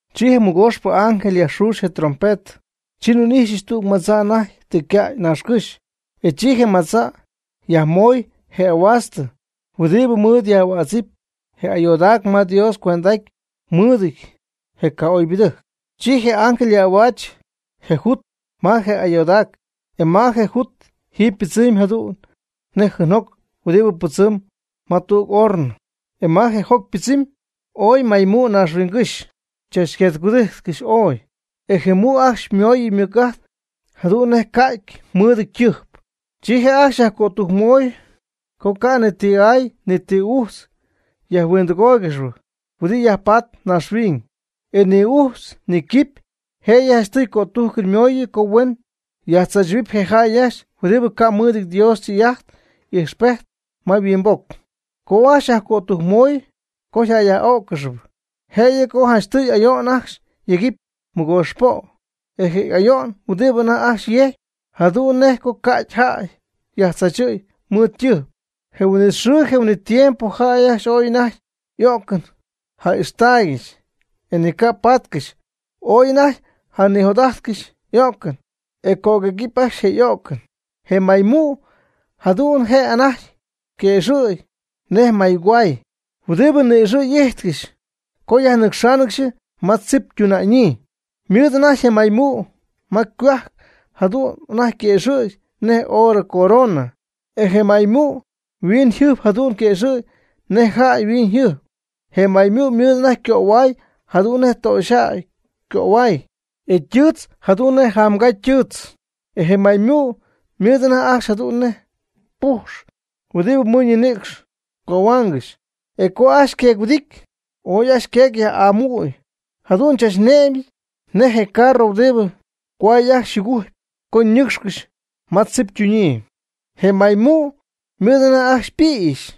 Chi je mɨgooxpɨ ángel yajxuxy je' ytrompetɨ, chi nhuin'ijxyɨch tüg madza' anajty tɨ ycäy naaxcɨ́xy. E chi je madza' yajmoy je ahuaastɨ huɨdibɨ mɨɨd yaj'ahuädzɨp je ayoodac ma Dios cuend'aty mɨɨdɨty je ca'oybɨdɨjc. Chi je ángel yaj'ahuaach je jut ma je ayoodac, e ma je jut jiiby ypɨdzɨmy jadu'n nej jɨɨnjoc huɨdibɨ pɨdzɨm ma tüg hornɨ. E ma je joc ypɨdzɨmy ooy maymu' naaxhuiñygɨ́xy chachqueec-huɨdijtcɨxy ooy, e je mu' ajcxy ymooyɨ mɨc'ajt, jadu'n nej ca'ty mɨɨdɨty ytɨjp. Chi je' ajcxy yajcötujcmoy co ca' ni ti aay ni ti ujtz yajhuindɨgóoygɨxɨpy huɨdibɨ yajpatp naaxhuiñ, ni ujtz ni quipy. Jëyɨ janchtɨy ycötujcɨn mooyɨ co huen yajtzaachɨ̈huɨpy je jäy ajcxy huɨdibɨ ca' mɨɨdɨty Dios ytɨy'ajt y'ijxpejt ma yhuimboc. Ca' ajcxy yajcötujcmoy co yjäyyaj'ó'ccɨxɨpy, jëyɨ co janchtɨy ayo'n ajcxy yegɨpy mɨgoox po'. E je ayo'n huɨdibɨ anajty ajcxy yejcpy jadu'n je' nej co ca'ty jäy yajtzaachɨ̈y mɨɨd ytɨjp. Je huin'it xɨɨ je huin'it tiempo jäy ajcxy ooy anajty o'cɨn ja'ixtaaygɨxy e ni ca' pátcɨxɨpy. Ooy anajty janijot'ájtcɨxy o'cɨn, e cöguëgɨɨb ajcxy je o'cɨn. Je maymu' jadu'n je' anajty yquëxɨ̈gy nej maygohuay huɨdibɨ ni'ixɨ̈'ijtcɨxp co yajnɨcxáanɨgɨxy ma tzip ytuna'ñyii. Ymɨɨd anajty je maymu' ma ycohuajc jadu'n anajty quëxɨ̈gy nej oorɨ coronɨ. E je maymu' yhuiñyjɨjp jadu'n yquëxɨ̈gy nej jäy yhuiñyjɨjp. Je maymu' ymɨɨd anajty ycöhuay jadu'n nej töxyjäy ycöhuay, e ytɨɨtz jadu'n nej jamgaa ytɨɨtz. E je maymu' ymɨɨd anajty ajcxy jadu'n nej pujx huɨdibɨ mɨɨd ñinïcx cohuangɨxy. E co ajcxy queec-huɨdity, ooy ajcxy yqueec yaj'amüy jadu'n chachne'mɨ̈y nej je carro huɨdibɨ cohuay ajcxy yjugujcpy co ñɨcxcɨxy ma tzip ytuñyii. Je maymu' ymɨɨd anajty ajcxy ypïxy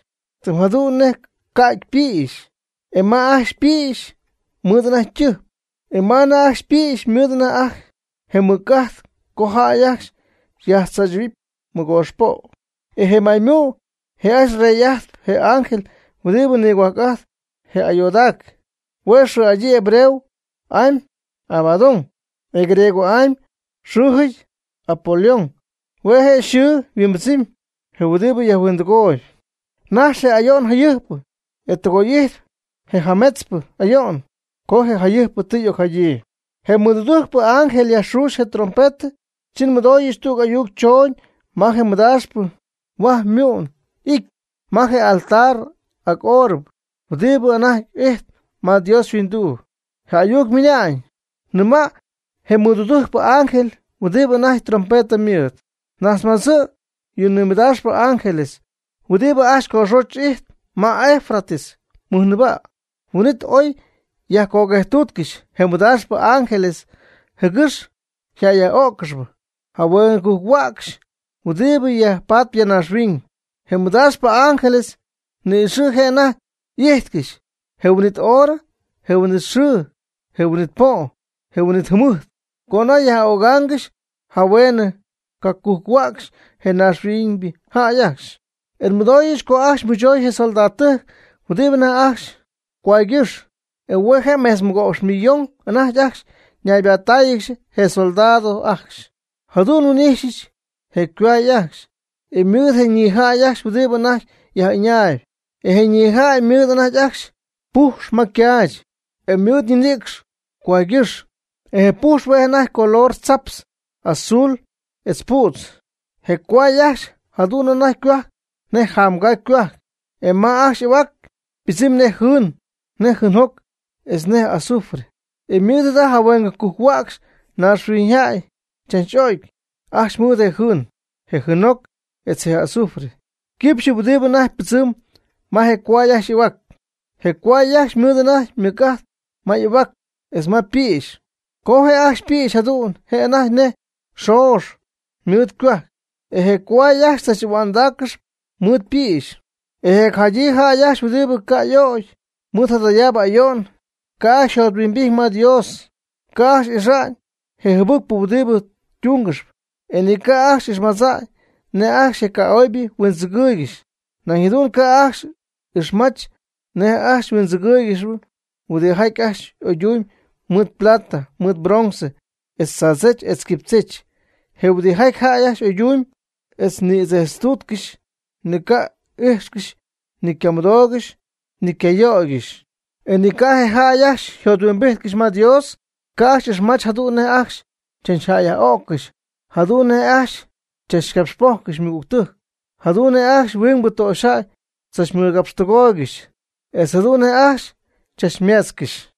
tɨm jadu'n nej ca'ty ypïxy, e ma ajcxy ypïxy ymɨɨd anajty ytɨjp. E ma ajcxy ypïxy mɨɨdɨty anajty je mɨc'ajt co jäy ajcxy yajtzaachɨ̈huɨpy mɨgoox po'. E je maymu' je' ajcxy yrey'ajtpy je ángel huɨdibɨ nigohuajc'ajtp je ayoodac, hue' xɨɨ'adyii hebreo'amy Abadón, e griego'amy yxɨɨjɨty Apolión, hue' je yxɨɨ yhuimbɨdzɨmy: je huɨdibɨ yajhuindɨgooyb. Najx je' je ayo'n jayɨjpɨ, e ytɨgoy'ity je jametzpɨ ayo'n co je jayɨjpɨ tɨ y'ocjadyii. Je mɨdudujcpɨ ángel yajxuuxy je ytrompetɨ, chi nmɨdooyɨch tüg ayuc chooñ ma je mɨdaaxpɨ huaj mu'n ity ma je altar ac óorɨbɨ, huɨdibɨ anajty ijtp ma Dios yhuinduu. Je ayuc ymɨna'ñ: ―Nɨma' je mɨdudujcpɨ ángel huɨdibɨ anajty trompetɨ mɨɨd: “Najtzmadzɨ' yɨ mɨdaaxpɨ ángeles huɨdibɨ ajcxy coxoch ijtp ma Eufrates mɨjnɨɨba'.” Huin'it oy yajcoguejttuutcɨxy je mɨdaaxpɨ ángeles, jɨgɨx yjäyyaj'o'ccɨxɨpy jahuen cacujc-huäcxy huɨdibɨ yajpatp ya naaxhuiñ. Je mɨdaaxpɨ ángeles ni'ixɨ' je' anajty y'ijtcɨxy, je huin'it horɨ, je huin'it xɨɨ, je huin'it po', je huin'it jɨmɨjt co anajty yaj'ögaangɨxy jahuen cacujc-huäcxy je naaxhuiñybɨ jäy ajcxy. E nmɨdooyɨch co ajcxy mɨchoy je soldadtɨjc huɨdibɨ anajty ajcxy cohuaygɨ́x. E hue' mejtz mɨgo'px millón anajty ajcxy ñaybattáayɨgɨxy je soldados ajcxy. Jadu'n nhuin'ijxyɨch je cohuay ajcxy, e mɨɨd je ñijäy ajcxy huɨdibɨ anajty yaj'ɨñaayb. E je ñijäy ymɨɨd anajty ajcxy pujx ma ycaach, je' mɨɨd ñinïcx cohuaangɨxy. E je pujx hue' anajty ycolor tzaptz, azul etz pu'tz. Je cohuay ajcxy jadu'n anajty ycohuajc nej jamgaa ycohuajc, e ma ajcxy y'ahuac ypɨdzɨmy nej jɨɨn, nej jɨɨnjoc, etz nej azufre. E mɨɨd jada jahueng cacujc-huäcxy naaxhuiñyjäy chach'o'cy ajcxy mɨɨd je jɨɨn, je jɨɨnjoc etz je azufre ycɨxpɨ huɨdibɨ anajty pɨdzɨmb ma je cohuay ajcxy y'ahuac. Je cohuay ajcxy ymɨɨd anajty mɨc'ajt ma y'ahuac etz ma pïxy. Com je' ajcxy ypïxy jadu'n je' anajty nej xoox mɨɨd ycohuajc, e je cohuay ajcxy chach'ahua'ndaaccɨxy mɨɨd ypïxy. E je jacjadyii jäy ajcxy huɨdibɨ ca' y'o'cy mɨɨd jadayaabɨ ayo'n, ca' ajcxy yjothuimbijty ma Dios, ca' ajcxy ixmajch je jɨbɨcpɨ huɨdibɨ ytungɨxp. E ni ca' ajcxy ixmajch nej ajcxy je ca'oybɨ huindzɨgɨɨygɨxy. Nañ jadu'n ca' ajcxy ixmajch nej ajcxy huindzɨgɨɨygɨxy huɨdijaty ajcxy oyduñyɨp mɨɨd plata, mɨɨd bronce, etz tzaadzech etz quipychech. Je huidɨjaty ajcxy y'oydumyb etz ñïdzejtztuutcɨxy, ni yca'ijxcɨxy, ni ycamɨdoogɨxy, ni ycayöygɨxy. E ni ca' je jäy ajcxy yjothuimbijtcɨxy ma Dios, ca' ajcxy ixmajch jadu'n nej ajcxy chachjäyyaj'o'ccɨxy, jadu'n nej ajcxy tzachcaxpojccɨxy ymɨgügtɨjc, jadu'n nej ajcxy huingbɨ töxyjäy tzachmɨgapxtɨgooygɨxy, etz jadu'n nej ajcxy chachmeetzcɨxy.